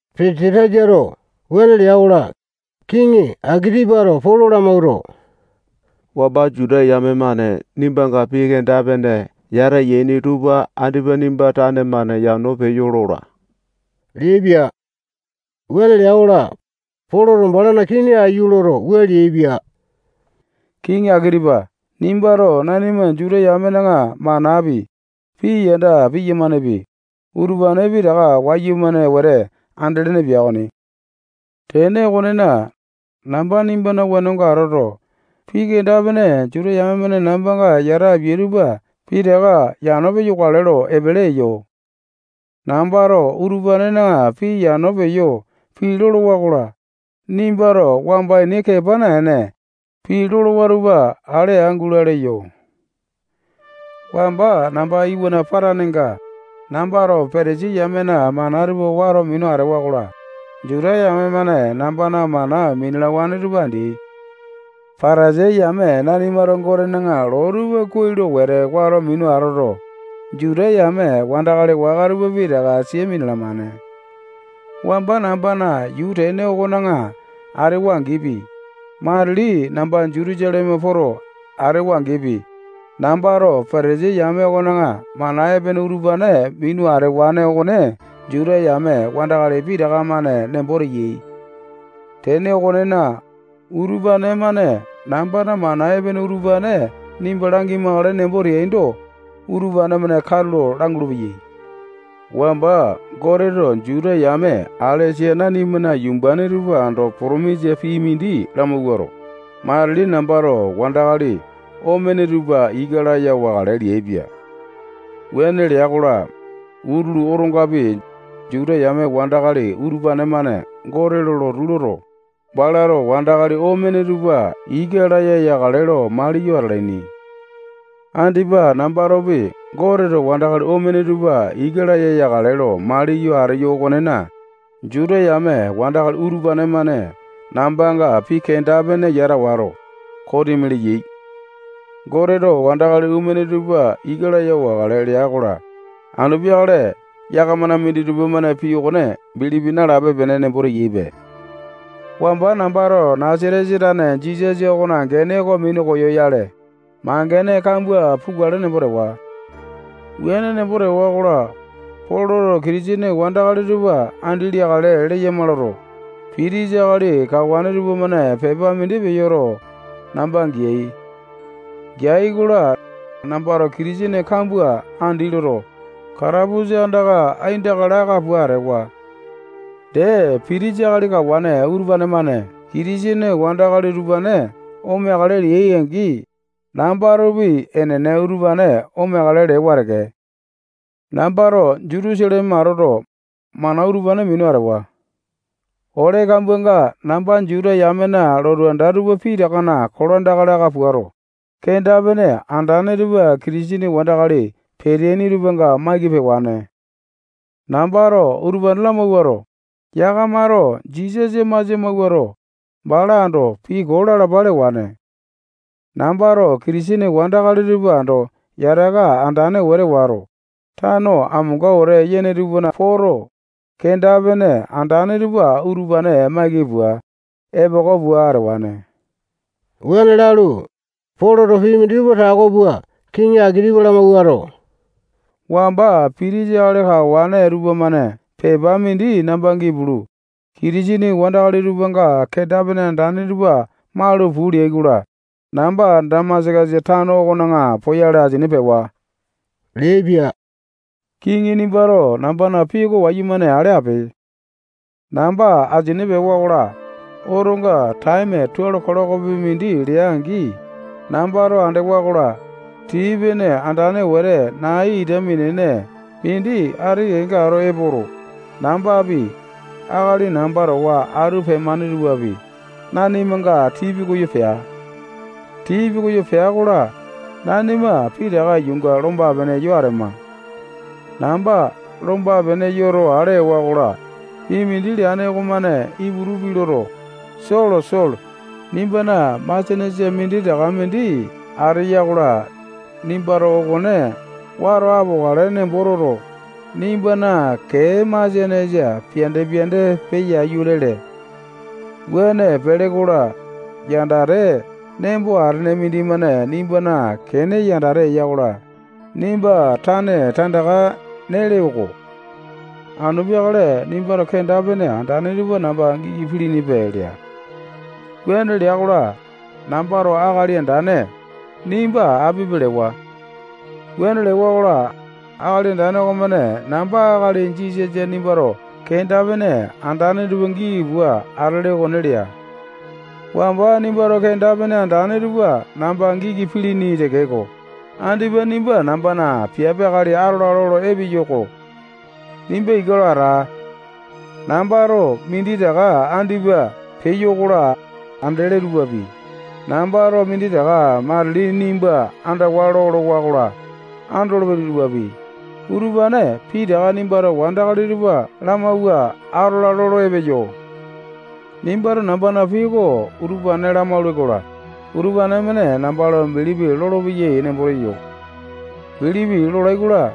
Pesatasato wuane lea-kola, kiŋi Akitipato Polo lamawuato, wamba Juta yame-mane nimbanga pii kenda-pene yata yaini tupa andipa nimba tane-mane yano peyo lola leaipia. Wuane lea-kola, Poloto balana kini aiyu loto, wua leaipia: Kiŋi Akitipa nimbato nanima Juta yamena manapi, pii yanda piyamanepi, utupane pitaka wayumane wete andelene pia okoni. Tene okonena, namba nimbana wenonga atoto, pii kenda-pene Juta yame-mane nambanga yata apia tupa pitaka yano peyo lokale lo epele eyo. Nambato utupanena pii yano peyo pii lolowa-kola, nimbato wamba ini kepa naene, pii lolowa tupa ale aa gula leyo. Wamba namba iwana patanenga, nambato Patasai yamena mana tupa wato minu atewa-kola, Juta yame-mane nambana mana minalawane tupa andeai. Patasai yame nanimato Gotena loo tupa kuai lo wete wato minu atoto, Juta yame wandakali waka tupa pitaka sia minalamane. Wamba nambana yuu tene okona atewa-angipi, matili namba Jutusaleme poto atewa-angipi, nambato Patasai yame okona mana epene utupane minu atewane okone Juta yame wandakali pitaka-mane nembo teyai. Tene okonena, utupane-mane nambana mana epene utupane nimba langimakale nembo teaindo, utupane-mane katulo langulu-peyai. Wamba Goteto Juta yame alesa nanimana yumbane tupa ando potomisa pii mindi lamawuato, matili nambato wandakali omene tupa ika laya wakale leaipia. Wuane lea-kola, utulu otongapi, Juta yame wandakali utupane-mane Gote lo lotu loto, balato wandakali omene tupa ika laya yakale lo maliyo atalaini. Andipa nambatopi Goteto wandakali omene tupa ika laya yakale lo maliyo ateyo okonena, Juta yame wandakali utupane-mane nambanga pii kenda-pene yata wato, kosimi leyai. Goteto wandakali omene tupa ika laya wakale lea-kola, anu peakale yakamana minditupa-mane pii okone bilipi nalape-pene nembo teyaipe. Wamba nambato Nasatesa tane Jisasa okona gene oko minu koyoyale, mangene kambua pukale nembo tewa. Wuane nembo tewa-kola, Poloto Kitisene wandakali tupa andi leakale leyama loto, pitisa akali kawane tupamane pepa mindi peyoto, namba geai. Geai-kola, nambato Kitisene kambua andi loto, katapusa andaka aindaka laka pua atewa. Dee, Pitisa akali kawane utupane-mane Kitisene wandakali utupane omeakale leai-angi, nambatopi enene utupane omeakale lewane teke. Nambato Jutusaleme atoto, mana utupane minu atewa. Ole kambuanga namba Juta yamena lotu anda tupa pitakana kolandaka laka puato, kenda-pene andane tupa Kitisene wandakali peteaini tupanga maiki pewane. Nambato utupane lamawuato, yakamato Jisasa masia mawuato, bala ando pii koo lalapa lewane. Nambato Kitisene wandakali tupa ando yataka andane wete wato, tano amonga wete yane tupana poto, kenda-pene andane tupa utupane maiki pua, epoko pua atewane. Wuane lalu, Poloto pii minditupa tako pua kiŋi Akitipa lamawuato, wamba Pitisa akali kawane tupamane pepa mindi namba gipulu, Kitisene wandakali tupanga kenda-pene andane tupa malu puu leai-kola, namba Damasakasa tano okona poyale asini pewa leaipia. Kiŋi nimbato nambana pii oko wayumane ale ape. Namba asini pewa-kola, otonga taeme tualo kilokopi mindi lea-angi, nambato andewa-kola, tii-pene andane wete nai ita minene mindi ati kenga ato epoto, nambapi, akali namba towa atu pemane tupapi, nanimanga tii pikoyo pea. Tii pikoyo pea-kola, nanima pitaka yuunga lomba-pene yo atema. Namba lomba-pene yoto ale ewa-kola, pii mindi leane okomane Iputu pii loto, Solo, Solo, nimbana masianesa minditaka mindi ateya-kola, nimbato okone wato apokale nembo toto, nimbana kee masianesa piande-piande peya aiyu lele. Wuane pele-kola, yandate nembo atene mindimane nimbana kene yandate eya-kola, nimba tane tandaka nele-ko. Anu peakale nimbato kenda-pene andane tupa namba giki pilinipe lea. Wuane lea-kola, nambato Akali Andane, nimba apipe lewa. Wuane lewa-kola, Akali Andane okomane namba akali Jisasa nimbato kenda-pene andane tupa giki pua atele okone lea. Wamba nimbato kenda-pene andane tupa namba giki pilini tekeko, andipa nimba nambana piape akali atola lolo epeyo-ko. Nimba ika lo ata. Nambato minditaka andipa peyo-kola, andele tupapi, nambato minditaka matili nimba andawa lolowa-kola, andolopele tupapi, utupane pitaka nimbato wandakali tupa lamawua atola lolo epeyo. Nimbato nambana pii oko utupane lamaule-kola, utupane-mane namba lo bilipi lolopeyai nembo teyo. Bilipi lolai-kola,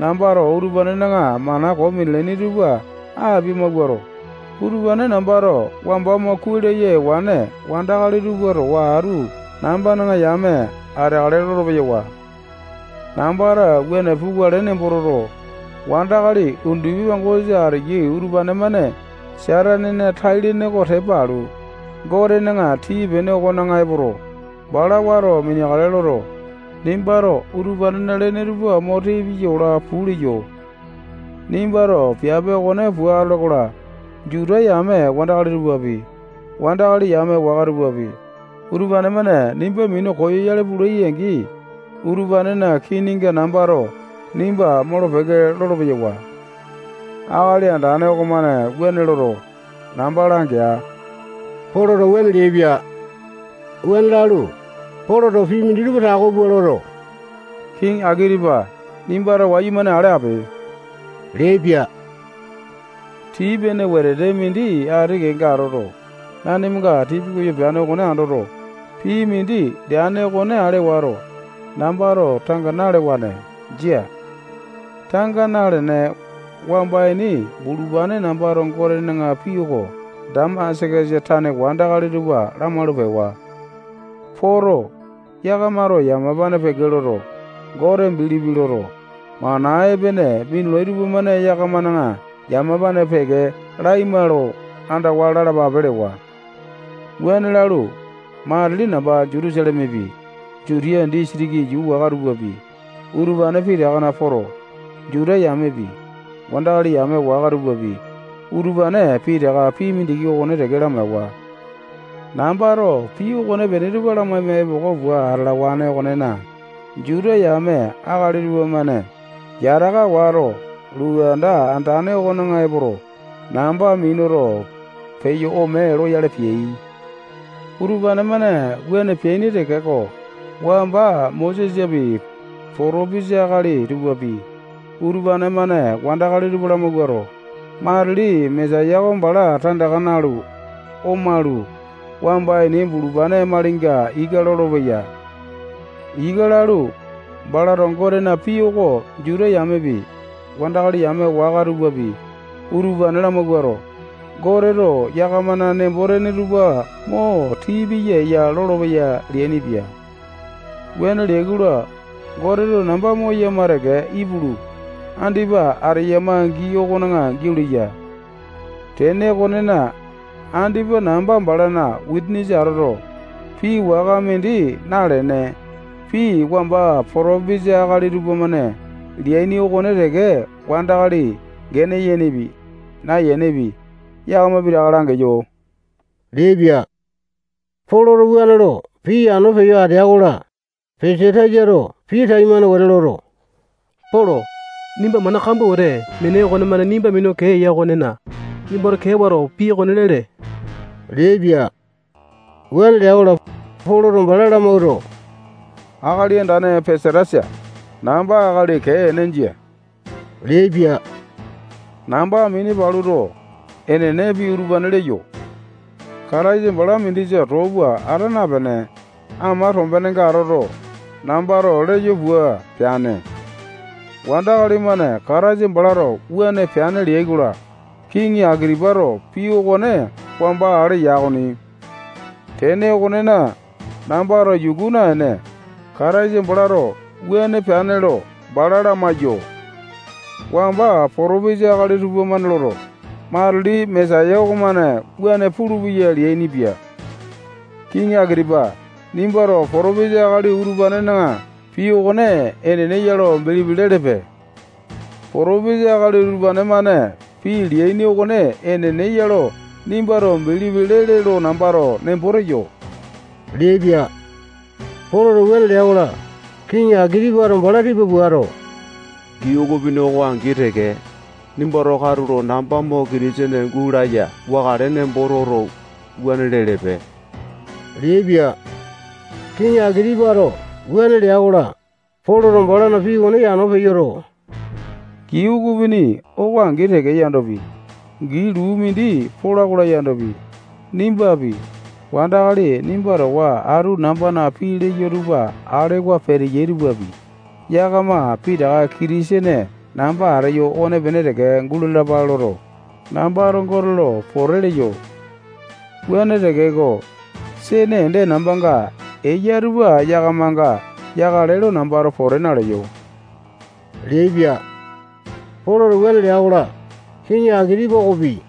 nambato utupanena mana koo minalaini tupa apia-mawuato, utupane nambato wamba mo kuai laya ewane wandakali tupa towa atu nambana yame ateakale lolo-peyawa. Nambato wuane pukale nembo toto, wandakali undupi pangosa ateyai utupane-mane Satanena tai-lene oko tepa alu, Gotena tii-pene okona epoto, bala wato miniakale loto, nimbato utupanena lene tupa mo tii piya olo puu leyo. Nimbato piape okone pua atole-kola, Juta yame wandakali tupapi, wandakali yame waka tupapi, utupane-mane nimba minu koyoyale pulai-angi, utupanena kininga nambato nimba molo-peke lolo-peyawa. Akali Andane okomane wuane loto, namba langea. Poloto wuane leaipia. Wuane lalu, Poloto pii minditupa tako pua loto, kiŋi Akitipa nimbato wayumane ale ape leaipia. Tii pene wetete mindi ati kenga atoto, nanimanga tii pikoyo peane okone andoto, pii mindi leane okone ale wato, nambato tanga nalewane. Jia. Tanga nalene, wamba ini bulupane nambato Gotena pii oko Damasakasa tane wandakali tupa lamalu pewa. Poto, yakamato yamapane peke loto, Gote bilipi loto, mana epene minulai tupamane yakamana yamapane peke laima lo andawa lalapape lewa. Wuane lalu, matili namba Jutusalemepi, Jutiya disitiki yuu waka tupapi, utupane pitakana poto, Juta yamepi, wandakali yame waka tupapi, utupane pitaka pii mindiki okone teke lamaewa. Nambato pii okonepene tupa lamaima epoko pua atalawane okonena, Juta yame akali tupamane yataka wato, lotu anda andane okona epoto, namba minuto, peyo ome loyale peai. Utupane-mane wuane peaini tekeko, wamba Mosesapi, potopesa akali tupapi, utupane-mane wandakali tupa lamawuato, matili Mesaya oko bala tandaka nalu, omalu, wamba ini bulupane malinga ika lolopeya. Ika lalu, balato Gotena pii oko Juta yamepi, wandakali yame waka tupapi, utupane lamawuato, Goteto yakamana nembo-tene tupa mo tii piya eya lolopeya leainipia. Wuane leai-kola, Goteto namba moyama teke ipulu, andipa ateyama gii okona giau leya. Tene okonena, andipa namba balana wisanisa atoto, pii waka mindi nalene, pii wamba potopesa akali tupamane leaini okone teke wandakali gene yenepi, nayenepi, yakama pitaka langeyo leaipia. Poloto wuane lo pii yano peyo atea-kola, Pesatasato pii taimane wete loto, Polo, nimba mana kambua wete meene okonemane nimba minu kee eya okonena, nimbato kee wato pii okone lele leaipia. Wuane lea-kola, Poloto bala lamawuato, akali andane Pesatasa, namba akali kee ene, jia leaipia. Namba mini paluto, enene pii utupane leyo. Kataisa bala mindisa too pua ata napene, ama tombenenga atoto, nambato leyo pua peane. Wandakali-mane Kataisa balato wuane peane leai-kola, Kiŋi Akitipato pii okone wamba ale ya okoni. Tene okonena, nambato yuku naene, Kataisa balato wuane peane lo bala lamaiyo. Wamba potopesa akali tupamane loto, matili Mesaya okomane wuane pulupeya leainipia. Kiŋi Akitipa nimbato potopesa akali utupanena pii okone enene ya lo bilipi lelepe. Potopesa akali utupane-mane pii leaini okone enene ya lo nimbato bilipi lele lo nambato nembo teyo leaipia. Poloto wuane lea-kola, Kiŋi Akitipato bala tipa puato, gii ukupini oko angi teke, nimbato katulo namba mo Kitisene gulaya wakale nembo toto, wuane lelepe leaipia. Kiŋi Akitipato wuane lea-kola, Poloto balana pii okone yano peyoto, gii ukupini oko angi teke yandopi, gii luu mindi pola-kola yandopi, nimbapi, wandakali nimba towa atu nambana pii leyo tupa alewa peteyai tupapi, yakama pitaka Kitisene namba ateyo okopene teke gulalapale loto, nambato Gote lo pote leyo. Wuane tekeko, sene ende nambanga eya tupa yakamanga yakale lo nambato pote naleyo leaipia. Poloto wuane lea-kola, kiŋi Akitipa okopi,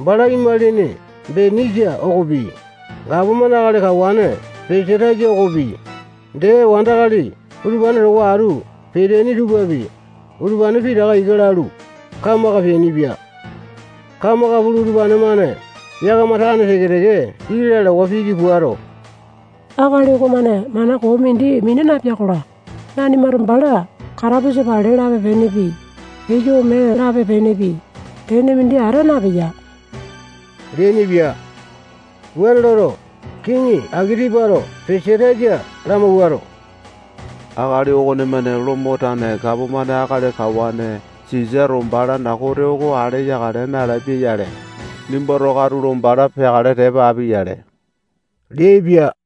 bala imalini Benisa okopi, gapomane akali kawane Pesatasa okopi, dee wandakali utupane towa atu peteaini tupapi, utupane pitaka ika lalu, kamaka peainipia. Kamaka pulu, utupane-mane yakama tane teke-teke pii lalawa piki puato, akali okomane mana koo mindi mina napea-kola, nanimato bala katapusa pale lape-penepi, peyo ome lape-penepi, tene mindi ata napeya leainipia. Wuane loto, wandakali utupane-mane Kiŋi Akitipato Pesatasa lamawuato, akali okonemane Lomo tane gapomane akali kawane Sisato balana kote oko ale yakale nalapia-yale, nimbato katulo bala peakale tepa api-yale leainipia.